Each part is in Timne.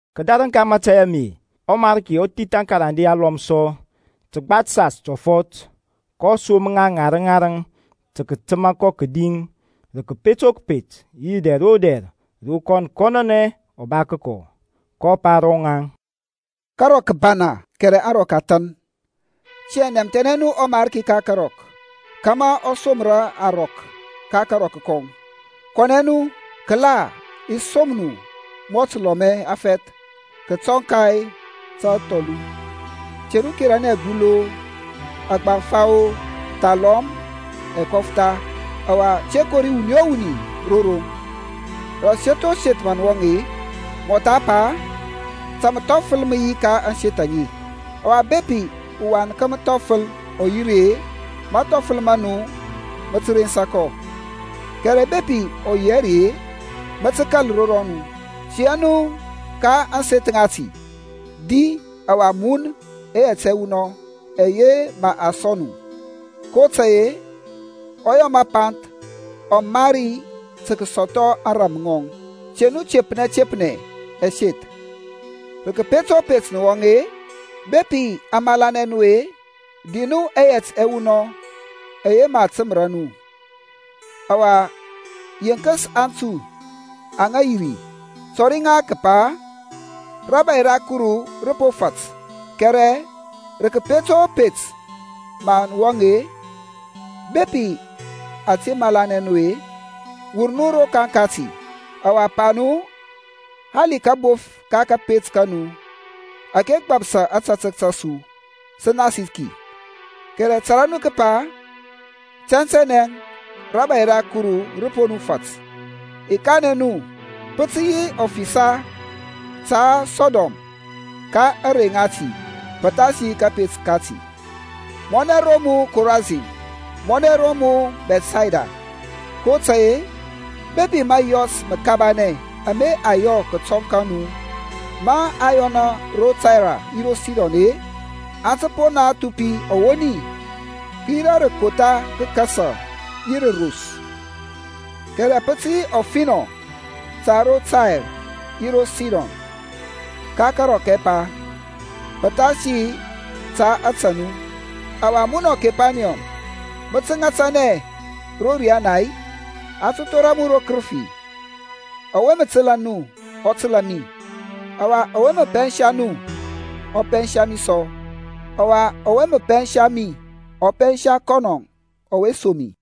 Kədarəŋ ka mȧtȧy ame ɔMarki ɔ thith akarande alɔm sɔ, təgba təsas tɔfɔt, kɔ som ŋa ŋarəŋ ŋarəŋ tə kətəma kɔ kədi rə kəpet o kəpet yi rə dɛr o dɛr ro kɔn kɔnɔnɛ ɔ ba kəkɔ. kɔ pa ro rɔŋaŋ, Karɔk kə bana kɛrɛ aŋrɔk a than. Tiyȧŋ nɛmthɛnɛ nu ɔMarki ka karɔk kȧmȧ ɔ somra arɔk ka karɔk kɔŋ. Kɔnɛ nu. Kəla i som nu mɔ təlɔmɛ təfɛth kətɔŋ ka tathɔlu. Te nu keranɛ abuthu-o, agbaŋfa-o, thalɔm ɛkɔftha. Ɔwa te kori wuni o wuni ro roŋ. Rə aseth o seth mə nə wɔŋ-e, mɔtha pa, Ta məthɔfəl mə yi ka ȧŋseth aŋe. Ɔwa bepi uwan ka məthɔfəl ɔ yi ri-e, mathɔfəl ma nu mə tə rensa kɔ, kɛrɛ bepi ɔ yi hɛ ri-e, mə tə kȧl ro rɔnu. Tia nu ka ȧŋseth ŋati, di ɔwa mun ɛyɛt ɛwunɔŋ ɛyɛ mə a sɔŋ nu, kotȧy-e ɔyɔ məpanth ɔ mari tə kəsɔthɔ ȧŋrȧm ŋɔŋ. Te nu tepnɛ tepnɛ ɛseth. Rə kəpet o pet nə wɔŋ-e, bepi a malanɛ nu-e, di nu ɛyɛt ɛwunɔŋ ɛyɛ mə a təməra nu. Ɔwa yenkəs aŋtui aŋa yi ri, tɔri ŋa kəpa, Rȧbȧy ra Kuru rə po nu fat. Kɛrɛ rə kəpet o pet mə nə wɔŋ-e, bepi aŋ te malanɛ nu-e, wur nu rokaŋ kati, ɔwa pa nu, Hali kabof ka kȧpet ka nu ȧke gbapsa ȧtȧtək ta su, sə nasi ki; kɛrɛ tȧrȧ nu kəpa, tɛntɛnɛ rȧbȧy ra Kuru rə po nu fat. I kanɛ nu, Pə tə yi ɔfisa ta Sɔdɔm ka ȧŋrey ŋati pəthasi kȧpet kati. Mɔnɛ ro mu, Korasin! Mɔnɛ ro mu Bɛthsayda! kotȧy-e bepi mȧyɔs məkabanɛ ama a yɔ kətɔŋ ka nu mə po yɔnɛ ro Tair yi ro Sidon-e, aŋ tə po thupi ɔwoni, kəyira rə kotha kəkasa yi rə ros. Kɛrɛ pə tə yi ɔfinɔ ta ro Tair yi ro Sidon ka karɔk ɛpa, pəthasi ta ȧtȧ nu. Ɔwa munɔ, Kepaniyɔm, mə tə ŋatanɛ ro riana-i? A tə thora mu ro kərəfi. Ɔwe mə təlȧ nu ɔ təlȧ mi, ɔwa ɔwe mə pɛnsa nu ɔ pɛnsa mi sɔ. Ɔwa ɔwe mə pɛnsa mi ɔ pɛnsa kɔnɔ ɔwe som mi.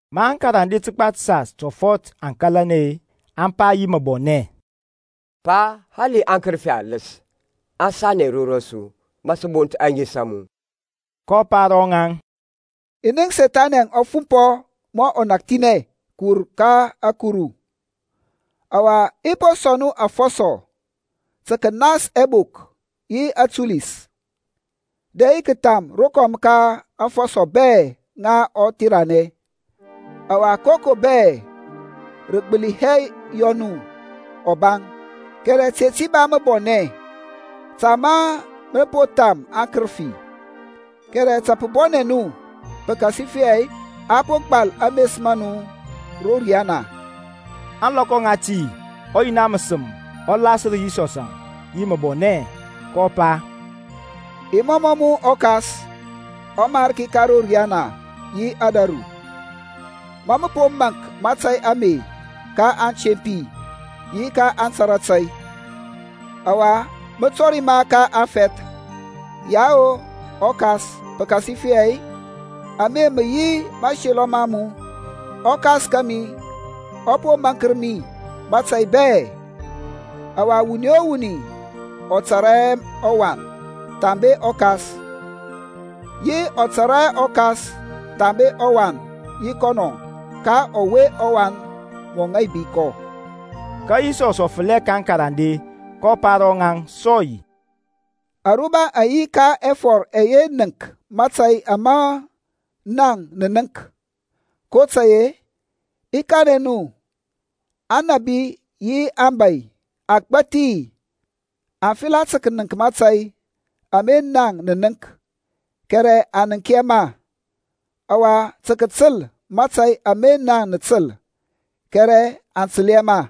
Ma aŋkarande təgba təsas tɔfɔt aŋ kalanɛ-e, aŋ pa yi məbɔnɛ, Pa, hali aŋkərəfi aləs aŋ sanɛ ro rɔsu ma sə bont ȧŋes a mu. kɔ pa ro ŋaŋ, I nənk Sethani ɔ fumpɔ mɔ ɔnakthinɛ kəwur ka ȧkuru. Ɔwa i po sɔŋ nu afɔsɔ tə kənas ɛbok yi atulis, dɛ yi kətham rokɔm ka aŋfɔsɔ bɛ ŋa ɔtheranɛ; ɔwa koko bɛ rə gbəli hɛ yɔ nu ɔbaŋ. Kɛrɛ te ti ba məbɔnɛ ta ma nə po tham aŋkərəfi, kɛrɛ ta pə bɔnɛ nu pəkasifɛ a po gbal ames ma nu ro riyana. Ȧŋlɔkɔ ŋati ɔYina məsəm ɔ lasər Yisɔsȧŋ yi məbɔnɛ, kɔ pa, I mɔmɔ mu ɔKas, ɔMarki ka ro riyana yi ȧdȧru, ma mə po maŋk mȧtȧy ame ka aŋtempi yi aŋtara tȧy, ɔwa mə tɔri ma ka aŋfɛth. Yao ɔKas pəkasifɛ ame mə yi mȧselɔ ma mu. ƆKas kȧmi ɔ po maŋkər mi mȧtȧy bɛ, ɔwa wuni o wuni ɔ tȧrȧ hɛ ɔWan thambe ɔKas; yi ɔ tȧrȧ hɛ ɔKas thambe ɔWan yi kɔnɔ ka ɔwe ɔWan mɔ ŋaibia kɔ. Ka Yisɔsȧŋ ɔ fəlɛ ka aŋkarande, kɔ pa ro rɔŋaŋ sɔy, Aruba aŋ yi ka ɛfɔr ɛyɛ nənk mȧtȧy ama naŋ nə nənk, kotȧy-e i kanɛ nu anȧbi yi abȧy agbȧthi aŋ fela tə kənəŋk mȧtȧy ama naŋ nə nənk, kɛrɛ aŋ nənk hɛ ma. Ɔwa tə kətəl mȧtȧy ama naŋ nə təl, kɛrɛ aŋ təl hɛ ma.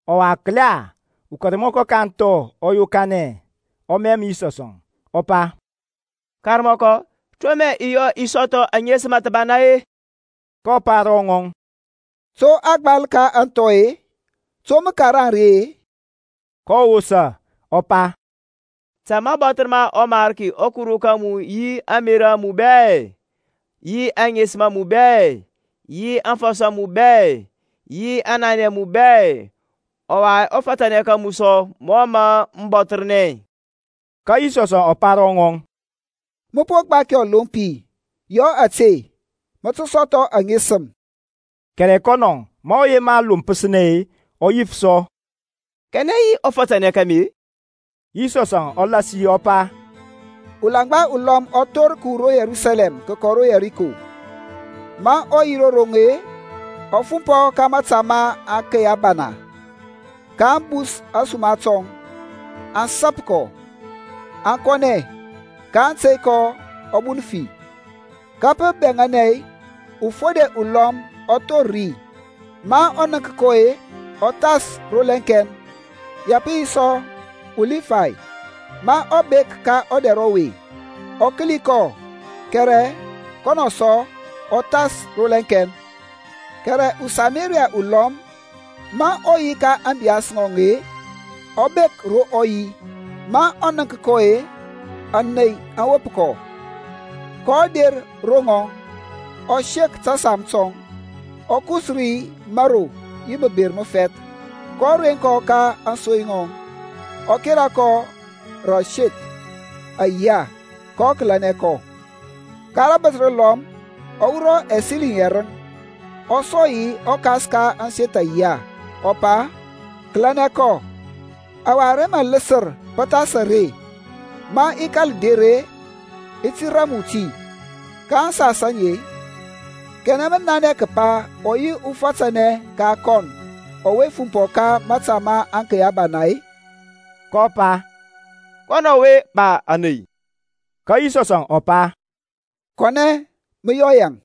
Ɔwa kəla ukarmɔkɔ ka aŋthɔ ɔ yokanɛ, ɔ mɛm Yisɔsȧŋ ɔ pa, Karmɔkɔ, to mə i yɔ kȧmȧ i sɔthɔ aŋesəm thəbana-e? kɔ pa ro ŋɔŋ, To a gbal ka aŋthɔ-e? To mə karaŋ ri-e? kɔ wosa ɔ pa, Ta mə bɔthər ɔMarki ɔKuru ka mu yi ȧŋmerȧ a mu bɛ, yi aŋesəm a mu bɛ, yi aŋfɔsɔ a mu bɛ, yi aŋnanɛ a mu bɛ; ɔwa ɔfatanɛ ka mu sɔ mɔ mȧ mə bɔthərnɛ. Ka Yisɔsȧŋ ɔ pa ro ŋɔŋ, Mə po gbaki ɔlompi. Yɔ ȧte, mə tə sɔthɔ aŋesəm. Kɛrɛ kɔnɔ, ma ɔ yema lompəsnɛ-e, ɔ yif sɔ, Kanɛ yi ɔfatanɛ ka mi-e? Yisɔsȧŋ ɔ lasi ɔ pa, Ulaŋgba ulɔm ɔ thor kəwur ro Yerusalɛm tə kəkɔ ro Yɛriko. Ma ɔ yi ro roŋ-e, ɔ fumpɔ ka mȧta ma aŋkey abana, kaŋ bus ȧsuma tɔŋ, aŋ sap kɔ, aŋ kɔnɛ, kaŋ tey kɔ ɔ bun fi. Ka pə bɛŋȧnɛ ufode ulɔm ɔ thor ri; ma ɔ nənk kɔ-e, ɔ thas rolɛŋkɛn. Ya pə yi sɔ uLibay, ma ɔ bek ka ɔdɛr ɔwe, ɔ kəli kɔ kɛrɛ kɔnɔ sɔ ɔ thas rolɛŋkɛn. Kɛrɛ uSamaria ulɔm, ma ɔ yi ka ȧŋbiyas ŋɔŋ-e, ɔ bek ro ɔ yi. Ma ɔ nənk kɔ-e, ȧney aŋ wop kɔ, kɔ der ro ŋɔŋ, ɔ sek tȧsam tɔŋ, ɔ kus ri mȧro yi məber məfɛth, kɔ reŋ kɔ ka ȧŋsoy ŋɔŋ, ɔ kera kɔ rə aseth ayiya, kɔ kəlianɛ kɔ. Ka rabəth rəlɔm ɔ wurɔ ɛsiliŋ yɛrəŋ, ɔ sɔŋ yi ɔkas ka ȧŋseth ayiya, ɔ pa, Kəlȧnɛ kɔ, ɔwa ara mə ləsər pəthas are, ma i kȧl der-e, i ti ram mu ti. Ka aŋsas aŋe-e, kanɛ mə nanɛ kəpa ɔ yi ufȧtȧnɛ ka kɔn ɔwe fumpɔ ka mȧta ma aŋkey abana-e? kɔ pa, Kɔnɔ ɔwe ba kɔ ȧney. Ka Yisɔsȧŋ ɔ pa Kɔnɛ, mə yɔ yaŋ.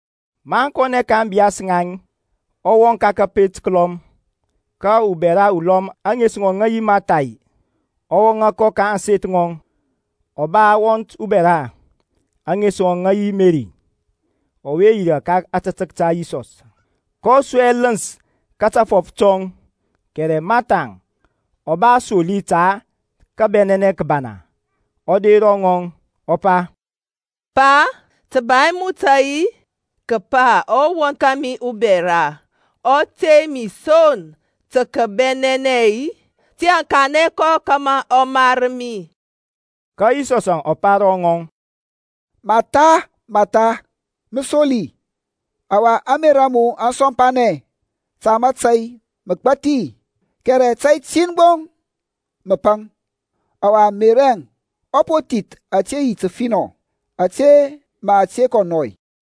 Maŋ kɔnɛ ka ȧŋbiyas ŋaŋ, ɔ wɔŋ ka kȧpet kəlɔm. Ka ubɛra ulɔm, ȧŋes ŋɔŋ ŋə yi Martha-e, ɔ wɔŋȧ kɔ ka ȧŋseth ŋɔŋ. Ɔ ba wɔnt bɛra, ȧŋes ŋɔŋ ŋə yi Meri, ɔwe yirȧ ka ȧtȧtək ta Yisɔsȧŋ, kɔ su ɛləns ka tafɔf tɔŋ. Kɛrɛ Mathaŋ ɔ ba asoli ta kəbɛnɛnɛ kəbana. Ɔ der ro ŋɔŋ, ɔ pa, Pa, tə ba hɛ mu tȧy kəpa ɔwɔnt kȧmi ubɛra ɔ tey mi son tə kəbɛnɛnɛ-i? Tiyȧŋ kanɛ kɔ kȧmȧ ɔ mar mi. Ka Yisɔsȧŋ ɔ pa ro ŋɔŋ, Matha, Matha mə soli, ɔwa ȧŋmerȧ a mu aŋ sɔmpanɛ ta mȧtȧy məgbathi. Kɛrɛ tȧy tin gbo mə paŋ, ɔwa Meri ɔ po thith ȧte yi təfinɔ, ȧtȧ mə a te kɔ nɔy.